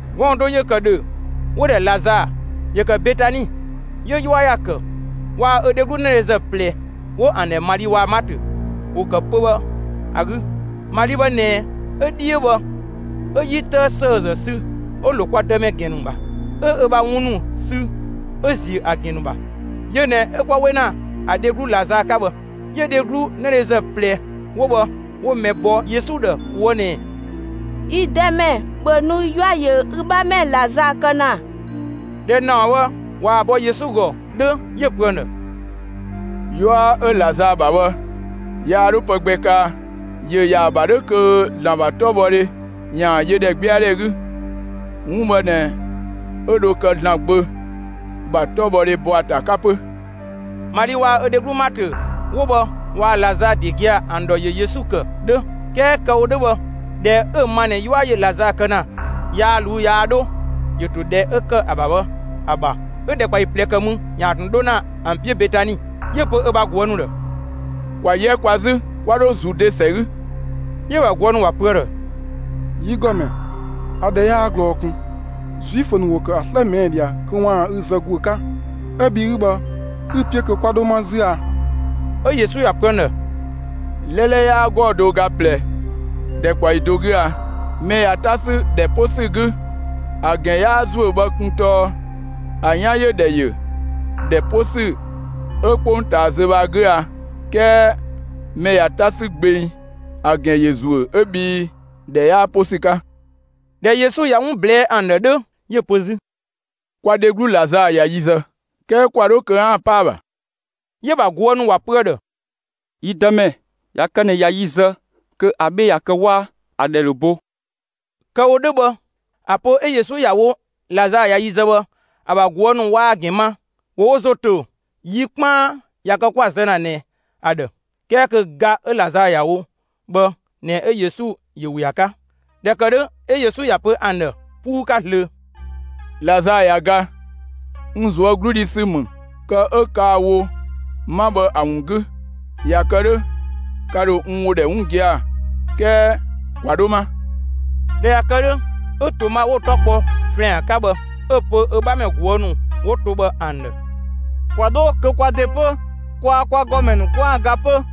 Gɔɔn‑ do ‑yö ‑kë ‑dhö, 'wo‑ ‑dhɛ Lazaa. ‑Yö ‑kë Betani. 'Yö 'yua ‑ya ‑kë. Waa‑ ö dheglu 'nëdhezë ꞊plɛ 'wo ‑an ‑dhɛ Mali waa‑ Maatö ‑wo ‑kë pö‑ bhë ‑a 'gü. Mali bhë ꞊nɛ, 'ö 'dhiö bhë 'ö 'yi 'tëë ‑sëëzë sü 'ö‑ ‑lo kwa Dëmɛ ‑gɛn ‑nu ‑bha, 'ö ö ‑bha wun ‑nu sü 'ö‑ ‑ziö ‑a ‑gɛn ‑nu ‑bha. Yö ꞊nɛ 'ö 'kwa 'we ‑na ‑a dheglu Lazaa 'ka bhë. 'Yö dheglu 'nëdhezë ꞊plɛ 'wo bhë 'wo mɛ bɔ Yesu ‑dhë ꞊woë' ꞊nɛɛ: «Yi Dëmɛ, ‑bhö nu; 'yua ‑yö ü 'bhamɛ Lazaa kë ‑na!» ꞊Dhɛ ‑naɔ bhë ꞊waa‑ bɔ Yesu ‑gɔ 'dhö, 'yö‑ pö ‑an ‑dhë: «'Yua 'ö Lazaa ‑bha bhë, yaa 'dho pë gbɛ kaa. ‑Yö ‑yaa ‑bha 'dhö kö ‑Zlan ‑bha 'tɔbhɔdhe ‑yaan yö ‑dhɛgbɛadhɛ 'gü; 'wun bhë ꞊nɛ 'ö dho kë ‑Zlan Gbö ‑bha 'tɔbhɔdhe ‑bɔ ‑a ‑ta 'ka 'pö.» Mali waa‑ ö dheglu Maatö 'wo bhë waa‑ Lazaa ‑de gia‑, ‑an ‑dhɔ ‑yö Yesu ‑kë 'dhö, 'kɛɛ kë‑ wo 'dhö bhë, ꞊dhɛ 'ö‑ ma ꞊nɛ 'yua ‑yö Lazaa kë ‑na, yaa ꞊luu'‑ yaa 'dho, ‑yö ‑to ‑dhɛ 'ö ‑kë ‑a ‑bha bhë ‑a ‑bha, 'ö ‑dhɛkpaɔyi ꞊plɛ ‑kë mü, ‑yaan ꞊tun 'dho ‑na ‑an 'piö Betani. 'Yö‑ pö ö ‑bha ꞊guë' ‑nu ‑dhë: «‑Kwa 'yɛ kwa 'zü 'kwa dho Zude ‑sɛ 'gü.» 'Yö‑ ‑bha ꞊guë' ‑nu ‑wa pö ‑a ‑dhë: «Yi ‑Gɔmɛ, ‑a ‑dhɛ yaa ꞊glɔɔ ꞊kun, Zuifö ‑nu ‑wo ‑kë ‑a 'slë ꞊mɛɛ' ꞊dhia kö ‑waan ü zë ‑guö 'ka, 'ö bhi 'ü bhë 'ü‑ 'piö kö 'kwa 'dho 'ma 'zü a?» 'Ö Yesu ‑ya pö ‑an ‑dhë: «'Lɛlɛ 'yaa 'gɔɔ‑ do ö ga ꞊plɛ ‑dhɛkpaɔyi do 'gü a? Mɛ ꞊ya 'ta 'sü ‑dhɛ 'po ‑sü 'gü ‑a ‑gɛn 'yaa zuö bhë kun tɔɔ ‑a 'yan ‑yö ‑dhɛ ‑yö ‑dhɛ 'po ‑sü 'ö 'kpongtaa zö bhë ‑a 'gü a. 'Kɛɛ mɛ ꞊ya 'ta 'sü gbeng, ‑a ‑gɛn ‑yö ‑zuö 'ö bhii ‑dhɛ 'yaa 'po ‑sü 'ka.» ꞊Dhɛ Yesu ꞊ya 'wun ꞊blɛɛ'‑ ‑an ‑dhë 'dhö, 'yö‑ pö 'zü: «Kwa dheglu Lazaa ꞊ya yi zë; 'kɛɛ ‑kwa 'dho kö 'aan‑ 'pa ‑a ‑bha.» 'Yö‑ ‑bha ꞊guë' ‑nu ‑wa pö ‑a ‑dhë: «Yi Dëmɛ, ꞊ya kë ꞊nɛ ꞊ya yi zë kö ‑a 'bhle ꞊ya kë 'waa; ‑a ‑dhɛ ‑dho bo.» Kë‑ wo 'dhö bhë, ‑a pö 'ö Yesu ‑ya wo Lazaa ꞊ya yi zë bhë, ‑a ‑bha ꞊guë' ‑nu waa‑ ‑gɛn ma. ‑Wo wo ‑zo ‑to yi 'kpaan ꞊ya kë 'kwa‑ zë ‑na ꞊nɛ ‑a ‑dhë, 'kɛɛ kö ga 'ö Lazaa ‑ya wo bhë ꞊nɛ 'ö Yesu ‑yö ‑we ‑a 'ka. ꞊Dhɛ ‑kë 'dhö, 'ö Yesu ‑ya pö ‑an ‑dhë 'puu 'ka zlöö: «Lazaa ꞊ya ga. N ꞊zuö' 'glu dhi ‑sü ‑mü kë 'ö kaa‑ wo 'ma bhë ‑a ‑wun 'gü. ꞊Ya kë 'dhö, ka ‑dho n ‑wo ‑dhɛ 'wun gia‑; 'kɛɛ ‑kwa 'dho 'ma.» ꞊Dhɛ ꞊ya kë 'dhö, 'ö Toma 'wo‑ 'tɔ kpɔ «‑Flɛan» 'ka bhë 'ö‑ pö ö 'bhamɛ ꞊guë' ‑nu 'wo to bhë ‑an ‑dhë: «‑Kwa 'dho kö kwa ‑de 'pö, kwaa‑ kwa ‑Gɔmɛ ‑nu 'kwaan‑ ga 'pö!»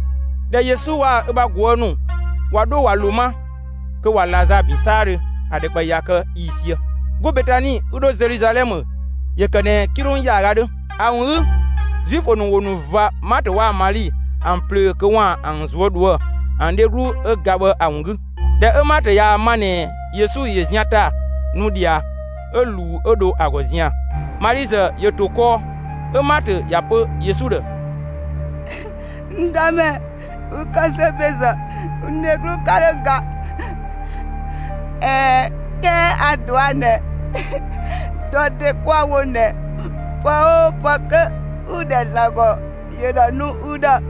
꞊Dhɛ Yesu waa‑ ö ‑bha ꞊guë' ‑nu ꞊wa 'dho ꞊wa ‑lo 'ma, kö ꞊wa Lazaa ‑bin 'saadhö ‑a ‑dhɛkpaɔyi ꞊ya kë ‑yiisië. 'Go Betani 'ü 'dho Zeluzalɛmë ‑yö ‑kë ꞊nɛ 'kilong ‑yaaga 'dhö. ‑A ‑wun 'gü, Zuifö ‑nu ‑wo ‑nu ꞊va Maatö waa‑ Mali ‑an ꞊plöö kö ‑waan ‑an ꞊zuö' ꞊dhuë'‑ ‑an dheglu 'ö ga bhë ‑a ‑wun 'gü. ꞊Dhɛ 'ö Maatö ‑ya ma ꞊nɛ Yesu ‑yö zian ‑ta nu ꞊dhia, 'ö ꞊luu 'ö dho ‑a ‑gɔ zian‑. Mali ‑zë ‑yö ‑to kɔɔ. 'Ö Maatö ‑ya pö Yesu ‑dhë: «N Dëmɛ, ü ‑kë zö ‑bezë, n dheglu 'ka 'dho ga. ꞊Ɛɛ, 'kɛɛ a‑ ꞊dɔa' ꞊nɛ dɔ ‑de 'kwa‑ wo ꞊nɛ pë 'oo pë kö 'ü‑ ‑dhɛ ‑Zlan ‑gɔ, ‑yö ‑dho ‑a nu ü ‑dhë.»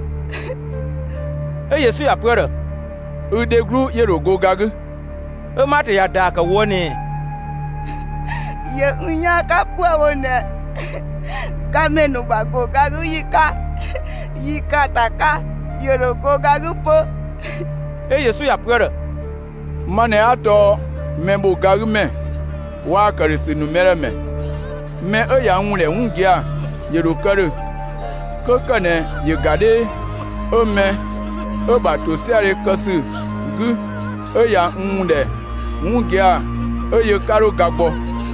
'Ö Yesu ‑ya pö ‑a ‑dhë: «Ü dheglu ‑yö ‑dho go ga 'gü.» 'Ö Maatö ‑ya ‑daa ‑kë ꞊woë' ꞊nɛɛ: «‑Yö n 'yaan 'ka 'püë‑ wo ꞊nɛ gamɛ ‑nu ‑bha ‑go ga 'gü ‑yi 'ka yi ‑kaanta 'ka, ‑yö ‑dho go ga 'gü 'pö.» 'Ö Yesu ‑ya pö ‑a ‑dhë: «Ma ꞊nɛ 'a tɔɔ mɛ ‑bho ga 'gü ‑mɛ waa‑ ‑këdhösü ‑nu mɛ ‑dhë ‑mɛ. Mɛ 'ö ꞊ya n ‑wun ‑dhɛ 'wun gia‑, ‑yö ‑dho kë ‑dhö 'kö ‑kë ꞊nɛ ‑yö ‑ga 'dhee; 'Ö mɛ 'ö‑ ‑bha ‑tosiadhe kë ‑sü 'gü, 'ö ꞊ya n ‑wun ‑dhɛ 'wun gia‑ 'ö yö 'ka 'dho ga gbɔ.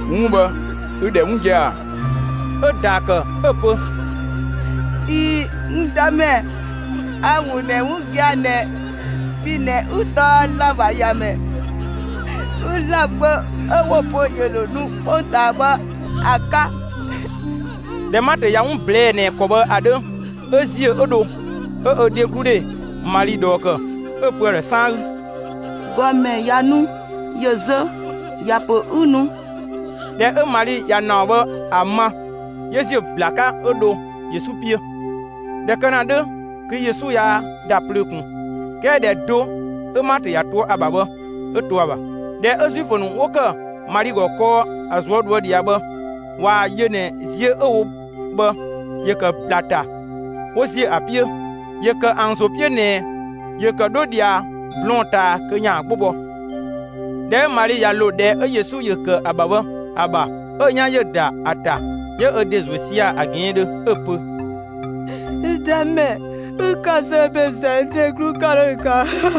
'Wun bhë, ü‑ ‑dhɛ 'wun gia‑ ‑a?» 'Ö‑ ‑daa ‑kë 'ö‑ pö: «꞊Ii‑, n Dëmɛ, a‑ ‑wun ‑dhɛ 'wun gia‑ ꞊nɛ bhi ꞊nɛ 'ü tɔɔ ‑Zlan ‑bha ‑Yamɛ, 'ü ‑Zlan Gbö 'ö 'wo‑ pö ‑yö ‑dho nu 'kpongtaa bhë ‑a 'ka.» ꞊Dhɛ Maatö ꞊ya 'wun ꞊blɛɛ'‑ ꞊nɛ ‑kɔ bhë ‑a 'dhö, 'ö ‑ziö 'ö dho 'ö ö dhegludhe Mali ꞊dhɔɔ ‑kë, 'ö‑ pö ‑a ‑dhë 'saan 'gü: «‑Gɔmɛ ꞊ya nu, ‑yö zö; ‑ya ‑pö 'ü nu.» ꞊Dhɛ 'ö Mali ꞊ya ‑naɔ bhë ‑a ma, 'yö ‑ziö ‑bla 'ka 'ö dho Yesu 'piö. ꞊Dhɛ kë ‑na 'dhö kö Yesu yaa ‑da plöö ꞊kun. 'Kɛɛ ‑dhɛ do 'ö Maatö ‑ya to ‑a ‑bha bhë 'ö to ‑a ‑bha. ꞊Dhɛ 'ö Zuifö ‑nu 'wo ‑kë Mali ‑gɔ kɔɔ ‑a ꞊zuö' ꞊dhuë' ꞊dhia bhë ꞊waa‑ yö ꞊nɛ ziö 'ö‑ wo bhë, ‑yö ‑kë ‑bla ‑ta, 'wo ‑ziö ‑a 'piö. ‑Yö ‑kë ‑an ‑zo 'piö ꞊nɛ ‑yö ‑kë 'dho ꞊dhia blɔɔn‑ ꞊taa kö ‑yaan 'gbo bɔ. ꞊Dhɛ 'ö Mali ꞊ya ‑lo ‑dhɛ 'ö Yesu ‑yö ‑kë ‑a ‑bha bhë ‑a ‑bha, 'ö‑ 'yan ‑yö ‑da ‑a ‑ta, 'yö ö ‑de ‑zuö sia‑ ‑a ꞊gɛɛndhö 'ö‑ pö: «N Dëmɛ, ü ‑kë zö ‑bezë, n dheglu 'ka 'dho ga.»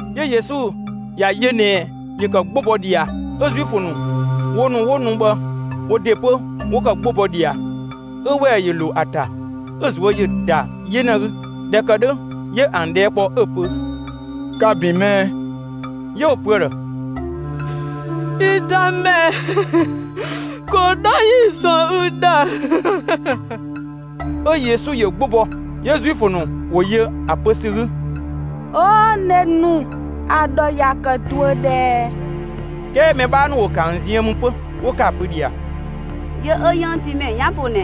'Yö Yesu ‑ya yö ꞊nɛ ‑yö ‑kë 'gbo bɔ ꞊dhia, 'ö Zuifö ‑nu 'ö wo ‑nu 'wo nu bhë wo ‑de 'pö, ‑wo ‑kë 'gbo bɔ ꞊dhia; 'ö ‑wɛɛ ‑yö ‑lo ‑a ‑ta, 'ö‑ ꞊zuö' ‑yö ‑da 'yena 'gü. ꞊Dhɛ ‑kë 'dhö, 'yö ‑an ꞊dhɛɛ' kpɔ, 'ö‑ pö: «Ka‑ ‑bin mɛɛ?» 'Yö 'wo‑ pö ‑a ‑dhë: «Yi Dëmɛ, ‑ko 'dho 'yi‑ ‑zɔn ü ‑dhë!» 'Ö Yesu ‑yö 'gbo bɔ. 'Yö Zuifö ‑nu ‑wo yö ‑a pö ‑sü 'gü: «'Oo nenu, ‑a ‑dhɔ ‑ya ‑kë ꞊duö ꞊dhɛɛ!» 'Kɛɛ mɛ 'bhaa ‑nu ‑wo ‑kë ‑an ziën mü 'pö, 'wo ‑kë ‑a pö ꞊dhia: «Yö 'ö 'yënngtiimɛ 'yan ‑po ꞊nɛ,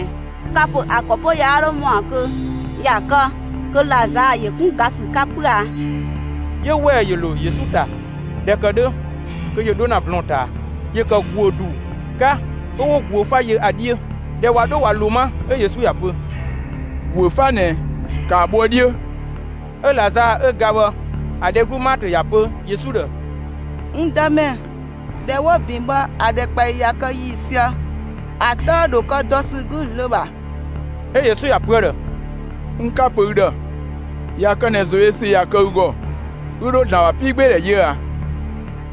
ka‑ ‑pö ‑a ‑kɔ 'pö yaa 'dhö ‑mɔa kö ꞊ya kë kö Lazaa ‑yö 'kun ga ‑sü 'ka 'pö a?» 'Yö ‑wɛɛ ‑yö ‑lo Yesu ‑ta 'zü; ꞊dhɛ ‑kë 'dhö kö ‑yö 'dho ‑na blɔɔn‑ ꞊taa. ‑Yö ‑kë ‑guö ‑du 'ka 'ö 'wo ‑guö 'fa yö ‑a 'dhiö. ꞊Dhɛ ꞊wa 'dho ꞊wa ‑lo 'ma 'ö Yesu ‑ya pö: «‑Guö 'fa ꞊nɛ, ‑kaa bho ‑a 'dhiö!» 'Ö Lazaa 'ö ga bhë ‑a dheglu Maatö ‑ya pö Yesu ‑dhë: «N Dëmɛ, ‑dhɛ 'wo‑ ‑bin bhë ‑a ‑dhɛkpaɔyi ꞊ya kë ‑yiisië; ‑a 'tëë ‑dhö kë dɔ ‑sü 'gü zlöö ‑bha.» 'Ö Yesu ‑ya pö ‑a ‑dhë: «N 'ka‑ pö ü ‑dhë, ꞊ya kë ꞊nɛ ‑zoyösü ꞊ya kë ü ‑gɔ, ü ‑dho ‑Zlan ‑bha 'piigbeedhɛ yö ꞊a?»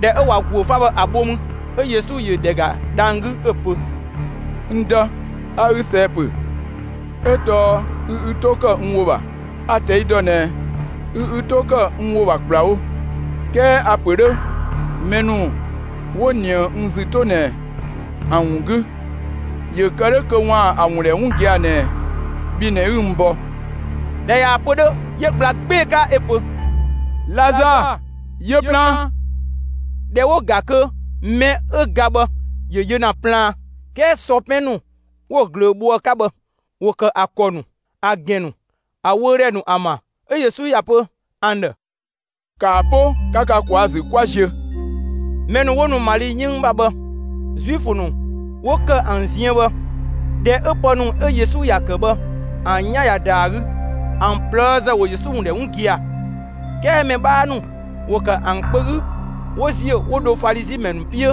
꞊Dhɛ 'ö ꞊wa ‑guö 'fa bhë ‑a bho mü, 'ö Yesu ‑yö ‑dhɛ ‑ga dhang‑ 'gü, 'ö‑ pö: «N Dë, a ü ꞊sɛɛ‑ ‑pö 'ö tɔɔ ü ü 'to ‑kë n ‑wo ‑bha. A‑ ꞊tɛi' ‑dɔ ꞊nɛ ü ü 'to ‑kë n ‑wo ‑bha ‑kplawo; 'kɛɛ a‑ ‑pö 'dhö mɛ ‑nu 'wo ꞊nië n ‑zü 'to ꞊nɛ ‑an ‑wun 'gü, ‑yö kë 'dhö kö ‑waan ‑a ‑wun ‑dhɛ 'wun gia‑ ꞊nɛ bhi ꞊nɛ 'ü n bɔ.» ꞊Dhɛ ꞊yaa‑ pö 'dhö, 'yö ‑gbla 'gbee‑ 'ka 'ö‑ pö: «Lazaa, yö plaan!» ꞊Dhɛ 'wo‑ ‑ga kö mɛ 'ö ga bhë ‑yö yö ‑na plaan, 'kɛɛ sɔ 'pɛn ‑nu 'wo‑ ꞊glöö bho ‑a 'ka bhë ‑wo ‑kë ‑a ‑kɔ ‑nu, ‑a ‑gɛn ‑nu, ‑a wöödhɛ ‑nu ‑an ‑bha. 'Ö Yesu ‑ya pö ‑an ‑dhë: «‑Kaa 'po 'ka ka ꞊kwaa'‑ ‑zü 'kwa ziö!» Mɛ ‑nu 'wo nu Mali 'yënng ‑bha bhë, Zuifö ‑nu 'wo ‑kë ‑an ziën bhë, ꞊dhɛ 'ö pë ‑nu 'ö Yesu ‑ya ‑kë bhë, ‑an 'yan ꞊ya ‑da ‑a 'gü, ‑an ꞊plëëzë ‑wo Yesu ‑wun ‑dhɛ 'wun gia‑. 'Kɛɛ mɛ 'bhaa ‑nu ‑wo ‑kë ‑an kpö 'gü 'wo ‑ziö 'wo dho Falizi ‑mɛ ‑nu 'piö,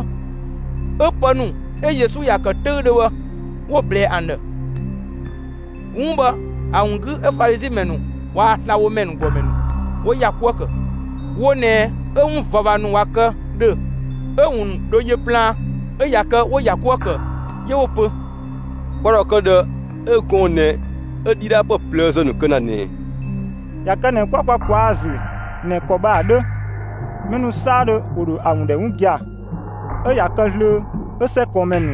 'ö pë ‑nu 'ö Yesu ‑ya ‑kë 'töüdhö bhë 'wo‑ ꞊blɛɛ ‑an ‑dhë. 'Wun bhë ‑a ‑wun 'gü 'ö Falizi ‑mɛ ‑nu waa‑ slabhomɛ ‑gɔmɛ ‑nu 'wo ‑ya 'kuë‑ ‑kë. Wo ꞊nɛ 'ö 'wun ꞊vava ‑nu ꞊wa kë ‑dhö 'ö‑ ‑wun dho yö plaan, 'ö ꞊ya kë 'wo‑ ‑ya 'kuë‑ ‑kë. 'Yö 'wo‑ pö: «Kwa ‑dhoë kë ꞊dhë 'ö gɔɔn‑ ꞊nɛ 'ö ‑dhidhaapë ꞊plëëzë ‑nu kë ‑na ꞊nɛɛ? ꞊Ya kë ꞊nɛ 'kwa kwa ꞊kwaa'‑ ‑a ‑zü ꞊nɛ ‑kɔ bhë ‑a 'dhö, mɛ ‑nu 'saadhö ‑wo ‑dho ‑a ‑wun ‑dhɛ 'wun gia‑; 'ö ꞊ya kë zlöö 'ö 'sɛkɔɔnmɛ ‑nu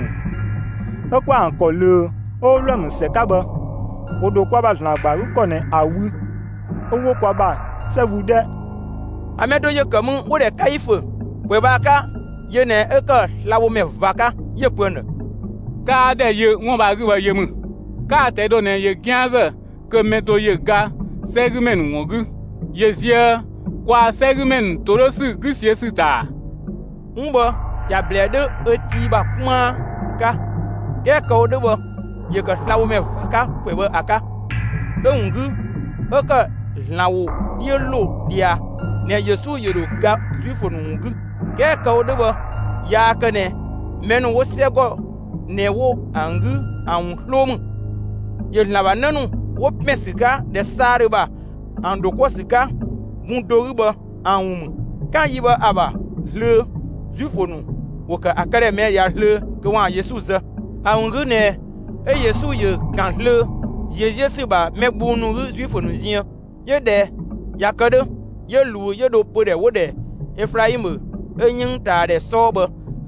('ö 'kwa ‑an ‑kɔ ꞊löö 'ö) 'wo Wlɔmë ‑sɛ 'ka bhë, 'wo ‑dho kwa ‑bha ‑Zlan ‑gba ‑a 'gü ‑kɔ ꞊nɛ ‑a wü 'ö 'wo kwa ‑bha 'sɛ wü 'dhɛ!» ‑An mɛ do ‑yö ‑kë mü 'wo‑ ‑dhɛ Kaifö. ‑Kwɛ bhë ‑a 'ka, yö ꞊nɛ 'ö ‑kë slabhomɛ ꞊va 'ka. 'Yö‑ pö ‑an ‑dhë: «'Kaa ‑dhɛ yö 'wun bhë ‑a 'gü bhë yö ‑mü! 'Kaa‑ ꞊tɛi' dɔ ꞊nɛ ‑yö 'gianzë kö mɛ do ‑yö ga 'sɛgümɛ ‑nu ‑wun 'gü, ‑yö ꞊zië' kwaa‑ 'sɛgümɛ ‑nu ‑todhösü 'gü ꞊siö' ‑sü ‑ta ‑a?» 'Wun bhë ‑ya ‑blɛɛ 'dhö ö tii ‑bha 'kpaan 'ka; 'kɛɛ kë‑ wo 'dhö bhë, ‑yö ‑kë slabhomɛ ꞊va 'ka ‑kwɛ bhë ‑a 'ka, 'ö‑ ‑wun 'gü, 'ö ‑kë ‑Zlan ‑wo 'dhiö ‑lo ꞊dhia ꞊nɛ Yesu ‑yö ‑dho ga Zuifö ‑nu ‑wun 'gü. 'Kɛɛ kë‑ wo 'dhö bhë yaa kë ꞊nɛ mɛ ‑nu 'wo 'sɛgɔ ꞊nɛ 'wo‑ 'gü ‑an ‑wun 'sloo ‑mü; ‑yö ‑Zlan ‑bha 'në ‑nu 'wo ‑pɛn ‑sü 'ka ‑dhɛ 'saadhö ‑bha ‑an ‑dho 'kuë‑ ‑sü 'ka bun do 'gü bhë ‑an ‑wun ‑mü. 'Kan yi bhë ‑a ‑bha zlöö, Zuifö ‑nu ‑wo ‑kë ‑a këdhɛ ꞊mɛɛ' ꞊dhia zlöö kö ‑waan Yesu zë. ‑A ‑wun 'gü ꞊nɛ 'ö Yesu ‑yö ‑kan zlöö ꞊ziö' 'ziö ‑sü ‑bha mɛ gbung ‑nu 'gü Zuifö ‑nu ziën. 'Yö ꞊dhɛ ꞊ya kë 'dhö, 'yö ꞊luu 'yö dho pödhɛ 'wo‑ ‑dhɛ Eflaimë 'ö 'yënngtaadhɛ 'sɔɔ bhë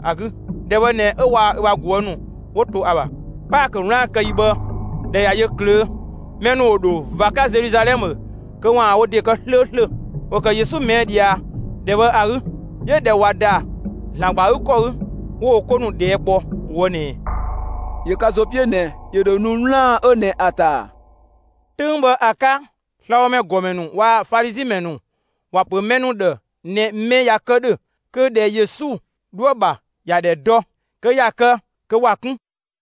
‑a 'gü. ‑Dhɛ bhë ꞊nɛ 'ö waa‑ ö ‑bha ꞊guë' ‑nu 'wo to ‑a ‑bha. Paakö 'wlaan‑ kë ‑yi bhë, ꞊dhɛ ꞊ya yö ꞊klöö', mɛ ‑nu ‑wo ‑dho ꞊va 'ka Zeluzalɛmë kö ‑waan wo ‑de kë 'slööslö. ‑Wo ‑kë Yesu ꞊mɛɛ' ꞊dhia ‑dhɛ bhë ‑a 'gü. 'Yö ꞊dhɛ ꞊wa ‑da ‑Zlan ‑gba ‑a 'gü ‑kɔ 'gü, 'wo wo 'ko ‑nu ꞊dhɛɛ' 'kpɔ ꞊woë' ꞊nɛɛ: «‑Yö ka ‑zo 'piö ꞊nɛ ‑yö ‑dho nu 'wlaan‑ 'ö ꞊nɛ ‑a ‑ta ‑a?» 'Töng bhë ‑a 'ka, slabhomɛ ‑gɔmɛ ‑nu waa‑ Falizi ‑mɛ ‑nu ‑wa ‑pö mɛ ‑nu ‑dhë ꞊nɛ mɛ ꞊ya kë ‑dhö kö ‑dhɛ Yesu 'dhoë‑ ‑bha ‑ya ‑dhɛ dɔ, kö ꞊ya kë kö ‑wa 'kun.